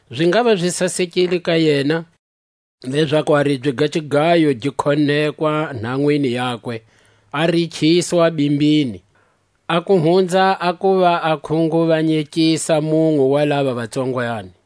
Zi ngava zi sasekile ka yena, lezaku a ribye ga xigayo gi khonekwa nhanwini yakwe, a rikhiswa bimbini, a ku hunza a kuva a khunguvanyekisa munwe wa lava va tsongwani.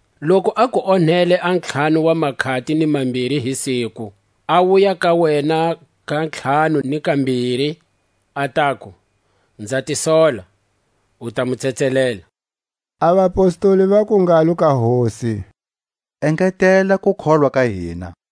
Loku a ku onhela a ntlhanu wa makhati ni mambiri hi siku, a wuya ka wena ka ntlhanu ni kambiri, a taku: Nza ti sola, u ta mu tsetselela. A vapostoli vaku ngalo ka Hosi: Engetela kukholwa ka hina.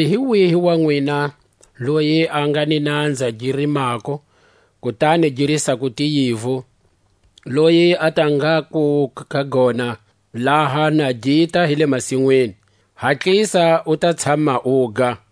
Kanilezi hi wihi wa nwina, loyi a nga ni nanza gi rimako, kutani gi risako tiyivu, loyi a ta ngaku ka gona laha na gita hi le masinwini: Hatlisa, u ta tshama uga?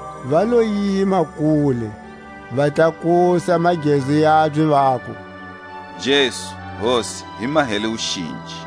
Va lo yima kule, va tlakusa magezu yabye, vaku: Jesu, Hosi, hi mahele wuxinji!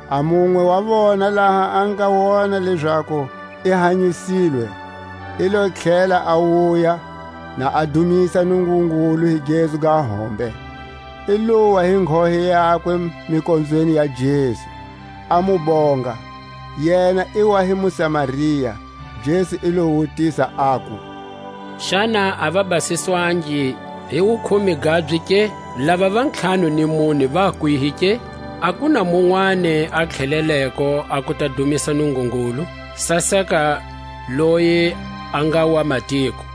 A munwe wa vona, laha a nga wona lezaku i hanyisilwe, i lo tlhela a wuya, na a dumisa Nungungulu hi gezu ga hombe. I lowa hi nghohe yakwe mikonzweni ya Jesu, a mu bonga; yena i wa hi muSamaria. Jesu i lo wutisa, aku: Xana a va basiswangi hi wukhume gabye ke? Lava va ntlhanu ni mune va kwihi ke? A ku na munwani a tlheleleko a ku ta dumisa Nungungulu, saseka loyi a nga wamatiko.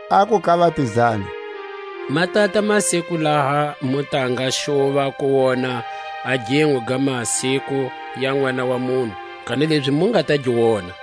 Aku ka vapizani: Ma tata masiku laha mu ta nga xuva ku wona a ginwe ga masiku ya Nʼwana wa munhu, kanilezi mu nga ta gi wena.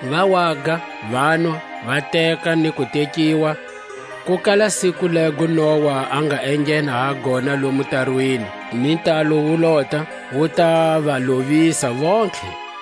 Va waga, vanwa, va teka, ni ku tekiwa, ku kala siku lego Noa a nga enghena ha gona lomo tarwini, ni ntalo wu lota, wu ta va lovisa vontlhe.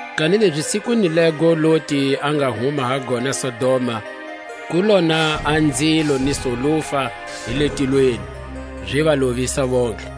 Kanilezi sikwini lego Loti a nga huma ha gona Sodoma, ku lona a nzilo ni solufa hi le tilweni, zi va lovisa vontlhe.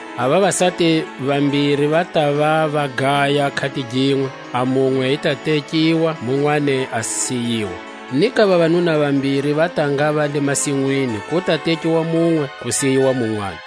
A vavasati vambiri va tava va gaya khatiginwe: a munwe i ta tekiwa, munwani a siyiwa. Ni ka vavanuna vambiri va ta ngava le masinwini ku ta tekiwa munwe, ku siyiwa munwani.